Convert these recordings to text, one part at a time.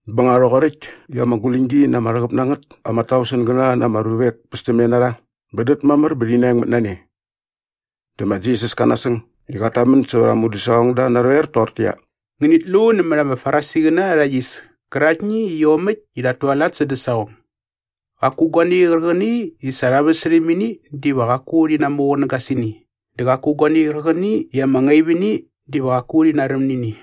Bä nga rhoqoräkt i ama guläñgi na ama rhäqäp na ngät ama tausengäna na ama ruvek pästämne na rha bä dät mamär bä rhi naengmät na ne. Dä ma Jisas ka nasäng i qat tamän sävät aa mudäsaqongda narhoer toqortäqyia, “Ngänit lu nämät ama Farisiqäna arha yis käraktni i iomäkt i rhat tualat sädä saqong. Qaku guani qärqäni i sa rha väsärhäm ini diva qaku rhi namuqunäga sä ini dä qaku guani qärqäni i ama ngaip ini diva qaku rhi naräm nä ini.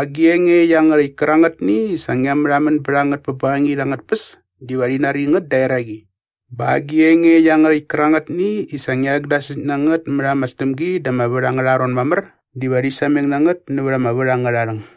Agi enge iangärhäkt kärangätni i sa ngia märhamän bät a ngät pä bängangit angät tpäs diva rhi nari ngät da eraqi bä agi enge iangärhäkt kärangätni i sa ngia rhäkdasäkt na ngät mät ama sdämgi da ama vät angärha ron mamär diva rhi sameng na ngät nävät ama vät angärha rhäng.”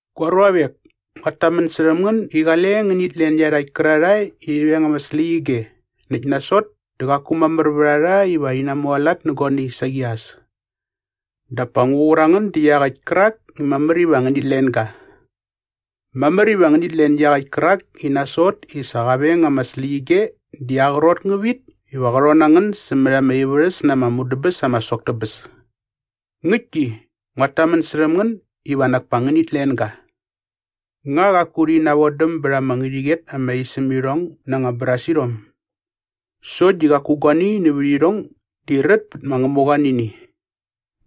“Gua ruavek, nguat tamän särhäm ngän i qale ngänit len iarhakt kärarhae i rhi veng ama släqyige näkt nasot dä qaku mamär vät a rha iva rhi namualat nä guani saqi as. Dap pa ngu qur a ngän da iaqäkt kärak i mamär iva ngänit len ga. Mamär iva ngänit len iaqäkt kärak i nasot i sa qa veng ama släqyige di aa qrot ngä vit iva qä rhon na ngän sämät ama ivärhäs na ama mudäbäs ama sok tä bäs. Ngäktki, nguat tamän särhäm ngän iva nak pa ngänit len ga. “Nga qaku rhi navodäm bät ama ngärhäqyet ama isämirhong na ama brasirhom? Sokt di qaku guani nävät irhong di rät pät ma Ngämuqa nä ini.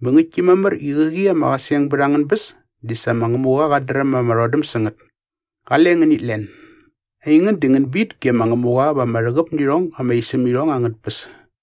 Bä ngäktki mamär i qäqi ama qäseng bät angän bäs di sa ma Ngämuqa qat dräm ama rhodäm sä ngät. Qale ngänit len. Aingän di ngän bit ge ma Ngämuqa va ama rhäqäp nä irhong ama isämirhong angät tpäs.”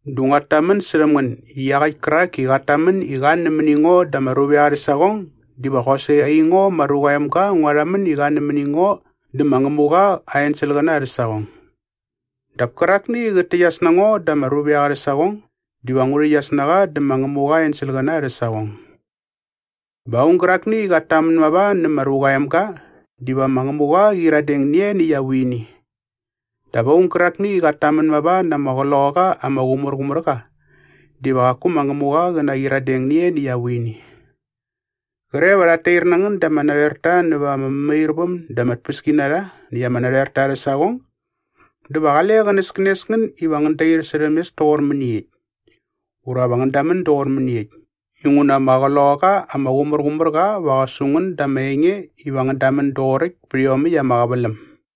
“Dä nguat tamän särhäm ngän i iaqäkt kärak i qat tamän i qa nämäni ngo da ama ruvek arhä saqong diva qosaqi aingo ma Ruqa aa Emga ngua rhamän i qa nämäni ngo dä ma Ngämuqa aa enselqäna arhä saqong. Dap kärakni i qät täqyas na ngo da ama ruvek arhä saqong diva ngu rhäqyas na qa dä ma Ngämuqa aa enselqäna arhä saqong. Bä aung gärakni i qat tamän mava nä ma Ruqa aa Emga diva ma Ngämuqa qä qyiradeng nä ianiäkt aa vuini. Dap aung gärakni i qat tamän mava na ama Qloqaqa ama Qumärqumärqa diva qaku ma Ngämuqa qa naqyiradeng nä ianiäkt aa vuini.” “Qre va rhat tair na ngän da ama narhoerta näva ama mämairväm dä ama tpäskinarha näkt ama narhoerta arhä saqong dä va qale qänäskänes ngän iva ngän dair särhäm mes toqor mäniekt ura va ngän damän doqor mäniekt inguna ama Qloqaqa ama Qumärqumärqa va qä su ngän da ama enge iva ngän damän doqoräkt pät iomäkt ama qäväläm.”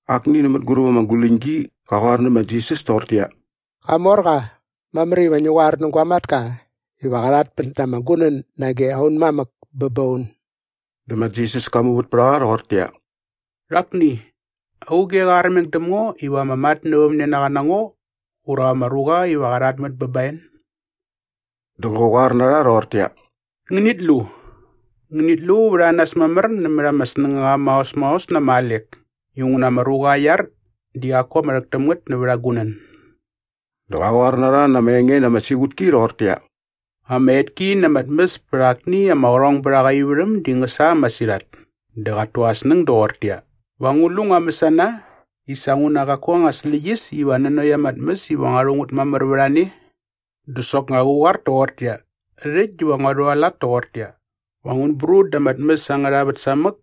Akni nä mänguräp ama guläñgi qa qoar nä ma Jisas toqortäqyia, “Qamorqa, mamär iva ngi qoar nä gua matka iva qa rhatmät ama gunän nage aun mamäk bä ba un.” Dä ma Jisas ka muvät pät a qa rhoqortäqyia, “Rhakni, auge qa armeng däm ngo iva ama matnävämnenaqa na ngo ura ama ruqa iva qa rhatmät bä ba en?” Dä qä qoar na rha rhoqortäqyia, “Ngänit lu! Ngänit lu vät a nas mamär nämät ama snängaqa maos maos na ama alek inguna ama ruqa aa iar di qaku ama rhäk täm ngät nävät aa gunän.” Dä qa qoar na rha na ama enge na ama siqutki rhoqortäqyia, “Ama etki na ama tmäs pät akni ama qärhongbärhaqa aa ivärhäm di ngä sa masirhat. Dä qat tu aa snäng doqortäqyia, ‘Va ngu lu ngua mäsana i sa nguna qaku anga släqyäs iva nanokt ama tmäs iva ngua rhu ngät mamär vät a ne?’ “Dä soknga qä qoar toqortäqyia, ‘Rhäkt diva ngua rhualat toqortäqyia. Va ngun brut da ama tmäs angärha vät samäk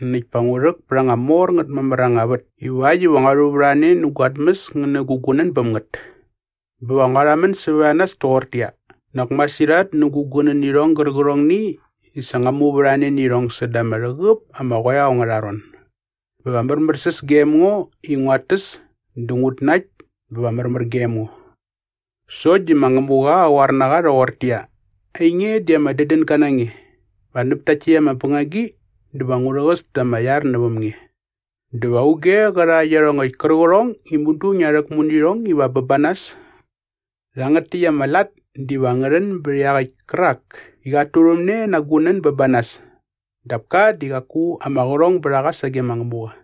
näkt pa ngu rhäk pät anga mor ngät mamär anga vät iva äkt näkt ngua rhuvärhane nä gua tmäs ngä nä gu gunän bäm ngät. Bä va ngua rhamän sävät a nas toqortäqyia, “Nak masirhat nä gu gunänirhong gärqärhongni i sa ngua muvärhane nä irhong säda ama rhäqäp ama qoeo angärha ron. Bä va märmärsäs gem ngo i nguat täs dä ngut nakt bä va märmär gem ngo.” ’ “Sokt di ma Ngämuqa qa qoar na qa rhoqortäqyia, ‘Ainge di ama dädänga na nge. Va näp takt täkt ama bängagi dä va ngu rhäqäs ta ama iar näväm nge. Dä va auge qä rha iarhongäkt kärqärhong i mudu ngia rhäkmu nä irhong iva bä ba nas?’ “Rhangät täkt ama lat diva ngä rhän bät iaqäkt kärak i qat tuvärhane na aa gunän bä ba nas dap ka di qaku ama qärhong bät a qa sage ma Ngämuqa.”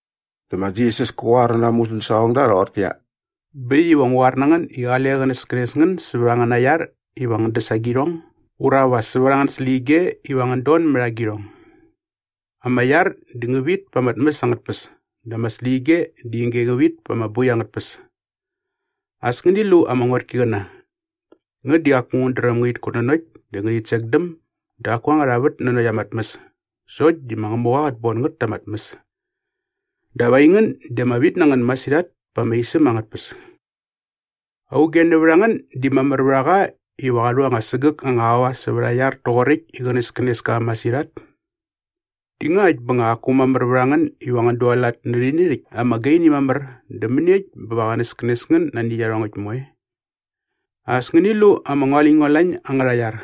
Dä ma Jisas kä qoar na aa mudäsaqongda rhoqortäqyia, “Bä äkt iva ngu qoar na ngän i qale qänäskänes ngän sävät angäna iar iva ngän däs agirhong ura va sävät angän släqyige iva ngän don mät agirhong. Ama iar di ngä vit pa ama tmäs angät tpäs dä ama släqyige di ige ngä vit pa ama boi angät tpäs. As ngäni lu ama ngotkiqäna. Ngät di qaku ngät dräm ngärhit kutnanokt dä ngärhit sekdäm dä qaku angät anga vät nanokt ama tmäs sokt di ma Ngämuqa qät bon ngät ta ama tmäs. Dap aingän di ama vit na ngän masirhat pa ama isäm angät tpäs. Auge nävät a ngän di mamär vät a qa iva qa rhu anga sägäk anga aua sävät aa iar toqoräkt i qänäskänes ka masirhat? Di ngakt bä nga qaku mamär vät a ngän iva ngän dualat nä rhäni rhäkt ama gaini mamär dä mäniekt bä va qänäskänes ngän nani iarhongäkt moe?” “As ngäni lu ama ngualäñngualañ angärha iar.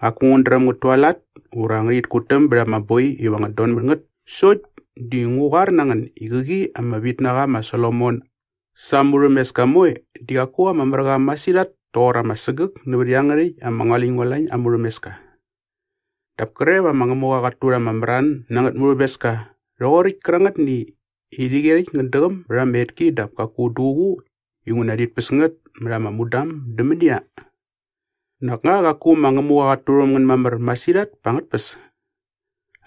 Qaku ngät dräm ngät tualat ura ngärhit kutäm bät ama boi iva ngät donmät sokt di ngu qoar na ngän i qäqi ama vitnaqa ma Solomon sa aa murhämeska moe di qaku ama mär qa masirhat toqor ama sägäk nävät iangärhäkt ama ngualäñngualañ aa murhämeska. Dap kre va ma Ngämuqa qat turha ama mran na angät murhämeska rhoqoräkt kärangätni i rhäqyerhäkt ngät däqäm bät ama etki dap kaku duququ inguna rhit päs ngät mät ama mudam dä mänia? Nak nga qaku ma Ngämuqa qat turhäm ngän mamär masirhat pa angät tpäs?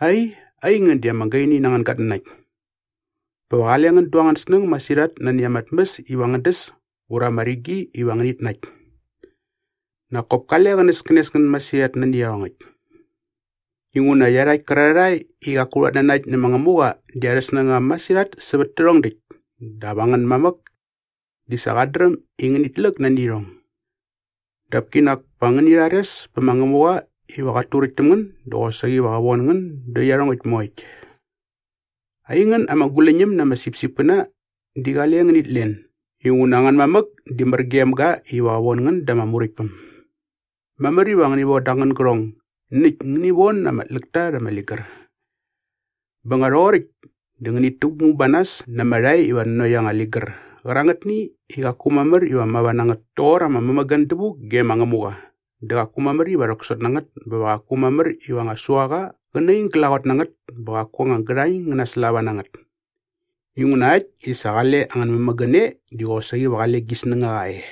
Ai, aingän di ama gaini nä angän gatnanakt! “Bä va qale ngän du angän snäng masirhat nani ama tmäs iva ngän däs ura ama rigi iva ngänit nakt. Nak kop kale qänäskänes ngän masirhat nani iarhongäkt. Inguna iarhakt kärarhae i qaku rhat nanakt nä ma Ngämuqa di arhä snängaqa masirhat sävät tärhong däkt dap angän mamäk di sa qat dräm i ngänit läk nani irhong. Dap kinak pa ngäni rhares pä ma Ngämuqa iva qat turäkt täm ngän dä qosaqi va qä von ngän dä iarhongäkt moekt.” “Aingän ama guläñäm na ama sipsipkäna di qale ngänit len inguna angän mamäk di mär gem ga iva qä von ngän da ama Muräktpäm. Mamär iva ngäni voda angän gärhong näkt ngäni von ama tläkta rha ama ligär. Bä nga rhoqoräkt dä ngänit täkmu ba nas na ama rhae iva nanokt anga ligär qärangätni i qaku mamär iva mava na ngät toqor ama mämägän dävuk ge ma Ngämuqa dä qaku mamär iva rhäksot na ngät bä va qaku mamär iva anga suaqa qä naing glaqot na ngät bä qaku anga gärhañ ngä naslava na ngät. Inguna äkt i sa qale angän mämägän e di qosaqi va qale gi snängaqa e.”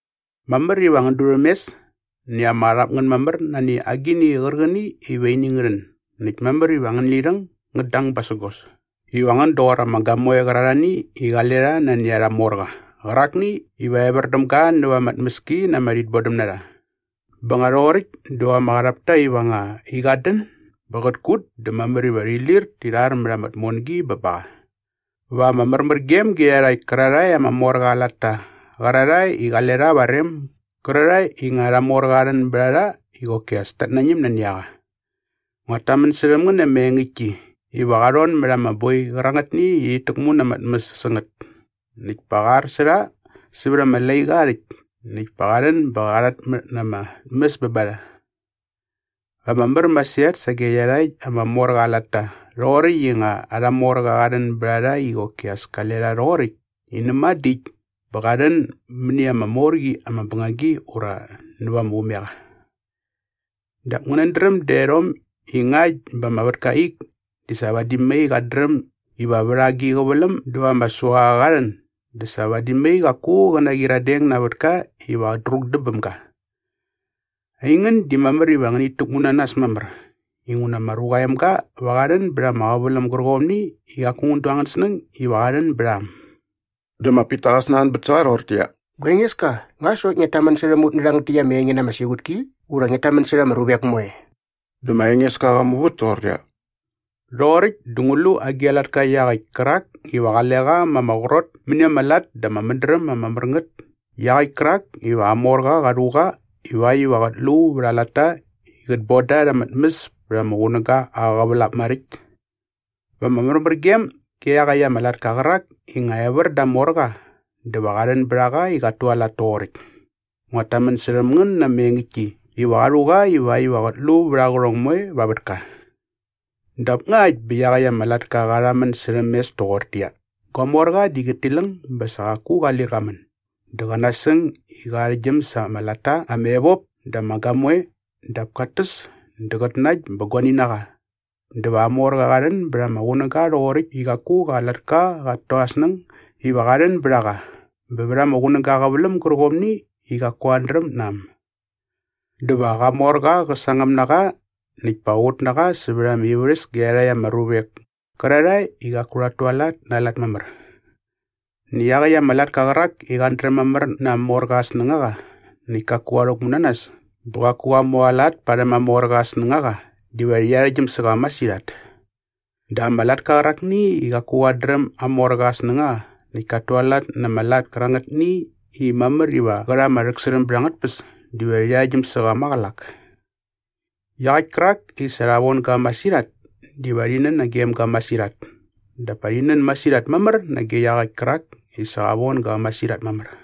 “Mamär iva ngän durhämes näkt ama qarhap ngän mamär nani agini qärqäni iva ini ngä rhän näkt mamär iva angän lirhäng ngät dang basägos iva ngän doqor ama gamoe qärarhani i qale rha nani arha morqa qärakni iva evär däm ga näva ama tmäski na ama rhitbodämnarha. Bä nga rhoqoräkt dä va ama qarhap ta iva nga i qat dän bä qät kut dä mamär iva rhi lir ti rhar mät ama tmongi bä ba qa. Va ama märmärgem ge iarhakt kärarhae ama morqa aa latta qärarhae i qale rha va aa rem gärarhae i nga arha morqa qa rhän bät a rha i qoki as tat nañäm nani a qa. Nguat tamän särhäm ngän na ama engäktki iva qa rhon mät ama boi qärangätni i rhit täkmu na ama tmäs sä ngät näkt pa qä ar sä rha sävät ama laiqa aa rhäkt näkt pa qa rhän bä qä rhatmät na ama tmäs bä ba rha. Va ama mär masirhat sage iarhakt ama morqa aa latta rhoqoräkt i nga arha morqa qa rhän bät a rha i qoki as kale rha rhoqoräkt i näma dä äkt bä qa rhän mäni ama mor qi ama bängagi ura näva ama umeqa. Dap ngänät dräm daerhom i ngakt bä ama vätka aa ik di sa vadi mai qat dräm iva vät agi a qäväläm dä va ama suaqa qa rhän dä sa vadi mai qaku qä naqyiradeng na aa vätka iva qä drukdäm bäm ga. Aingän di mamär iva ngänit täkmu na nas mamär inguna ma Ruqa aa Emga va qa rhän bät ama qäväläm gärqomni i qaku ngän du angän snäng iva qa rhän bät a äm.” Dä ma Pita qa snanbät sä qa rhoqortäqyia, “Gua Engeska, nga sokt ngiat tamän särhäm ut nä rhangät täkt ama enge na ama siqutki ura ngiat tamän särha ama ruvek moe?” Dä ma Engeska qa muvät toqortäqyia, “Rhoqoräkt dä ngu lu agi a latka iaqäkt kärak iva qale qa ma ama qrot mäni ama lat dä aa mädräm ama mär ngät iaqäkt kärak iva aa morqa qa rhu qa ivakt iva qät lu vät aa latta i qät boda rha arha tmäs pät ama qunäga aa qävälap maräkt? Va ama märmärgem ge iaqäkt ama latka qärak i nga evär da aa morqa dä va qa rhän bät a qa i qat tualat toqoräkt. Nguat tamän särhäm ngän na ama engäktki iva qa rhu qa ivakt iva qät lu vät aa qärhong moe va aa vätka. “Dap ngakt bä iaqäkt ama latka qa rhamän särhäm mes doqortäqyia, ‘Gua morqa di qät tiläng bä sa qaku qa lir qa män’ dä qä nasäng i qä arhäktgyäm sa ama latta ama evop dä ama gamoe dap kat täs dä qät nakt bä guani na qa dä va aa morqa qa rhän bät ama qunäga rhoqoräkt i qaku qa latka qat tu aa snäng iva qa rhän bät a qa bä vät ama qunäga aa qäväläm gärqomni i qaku qat dräm na äm. Dä va qa morqa qä sangäm na qa näkt pa qä qut na qa sävät ama ivärhäs ge iarhakt ama ruvek kärarhae i qaku rhat tualat na aa lat mamär. “Näkt iaqäkt ama latka qärak i qat dräm mamär na aa morqa aa snängaqa näkt kaku qa rhäkmu na nas bä qaku qa mualat parhäm aa morqa aa snängaqa diva rhi arhäktgyäm sä qa masirhat. Dap ama latka qärakni i qaku qat dräm aa morqa aa snängaqa näkt kat tualat na ama lat kärangätni i mamär iva qä rha ama rhäksärhäm bät angät tpäs diva rhi arhäktgyäm sä qa maqälak. Iaqäkt kärak i sa rha von ga masirhat diva rhi nän nagem ga masirhat dap pa rhi nän masirhat mamär nage iaqäkt kärak i sa rha von ga masirhat mamär.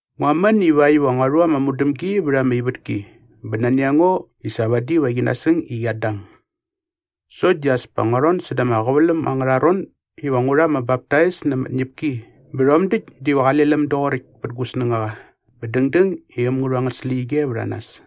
“Ngua män ivakt iva ngua rhu ama mudämgi vät ama ivätki bä nani a ngo i sa vadi va qi nasäng i qiat dang! Sokt di as pa ngua rhon säda ama qäväläm angärha ron iva ngu rha ama baptais na ama tñäpki bä rhom däkt diva qale läm doqoräkt pät gu snängaqa bä dängdäng i äm ngä rhu angät släqyige vät a nas.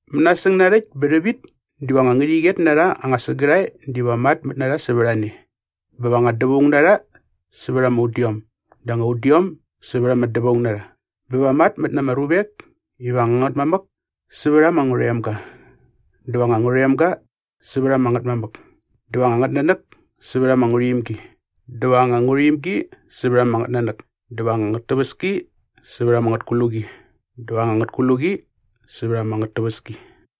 Mänasäng narhäkt bä rhävit diva anga ngärhäqyet na rha anga sägärhae diva matmät ta sävät a ne bä va anga dävaung na rha sävät ama udiom dä anga udiom sävät ama dävaung na rha. Bä va matmät na ama ruvek iva anga ngätmamäk sävät ama ngärhoemga dä va anga ngärhoemga sävät ama ngätmamäk dä va anga ngätnanäk sävät ama ngärhuimgi dä va anga ngärhuimgi sävät ama ngätnanäk dä va anga ngätäväski sävät ama ngätkluqi dä va anga ngätkluqi sävät ama ngätäväski.”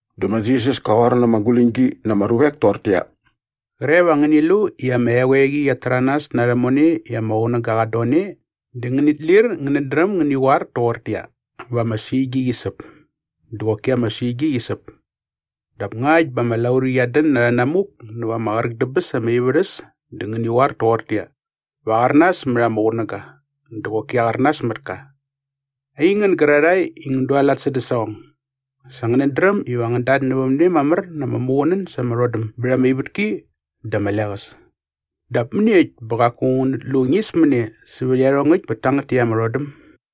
Dä ma Jisas ka qoar na ama guläñgi na ama ruvek toqortäqyia, “Qre va ngäni lu i ama eqoeqi qiat täranas na rhämone i ama qunäga qat don e dä ngänit lir ngänät dräm ngäni qoar toqortäqyia, ‘Va ama suigi qi säp’ dä qoki ama suigi qi säp. Dap ngakt bä ama laurqi qiat dän na rhänamuk näva ama qräk dä bäs ama ivärhäs dä ngäni qoar toqortäqyia, ‘Va aqärnas mät ama qunäga’ dä qoki aqärnas mät ka. Aingän gärarhani i ngän dualat sädä saqong, sa ngänät dräm iva ngän datnävämne mamär na ama muqunän sa ama rhodäm bät ama ivätki dä ama leqäs. Dap mäniekt bä qaku ngänät lu ñismäne sävät iarhongäkt pät tangät täkt ama rhodäm?”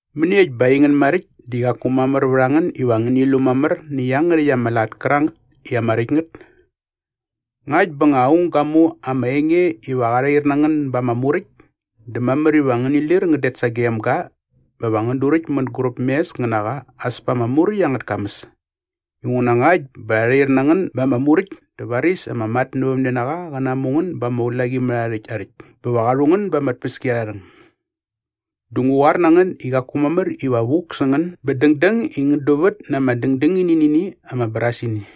“Mäniekt bä aingän maräkt di qaku mamär vät a ngän iva ngäni lu mamär nä iangärhäkt ama lat kärangät i ama räkt ngät? Ngakt bä nga aung ga mu ama enge iva rha rhair na ngän ba ama muräkt dä mamär iva ngäni lir ngän det sagem ga bä va ngän duräkt mänguräp mes ngän na qa as pa ama muräkt angät kamäs. Inguna ngakt bä rha rhair na ngän ba ama muräkt dä varis ama matnävämnenaqa qä namu ngän ba ama ulaqimärhaarhäkt aa rhäkt bä va qa rhu ngän ba ama tpäskiarharhäng. Dä ngu qoar na ngän i qaku mamär iva vuk sä ngän bä dängdäng i ngän duvät na ama dändängini nä ini ama brasini.”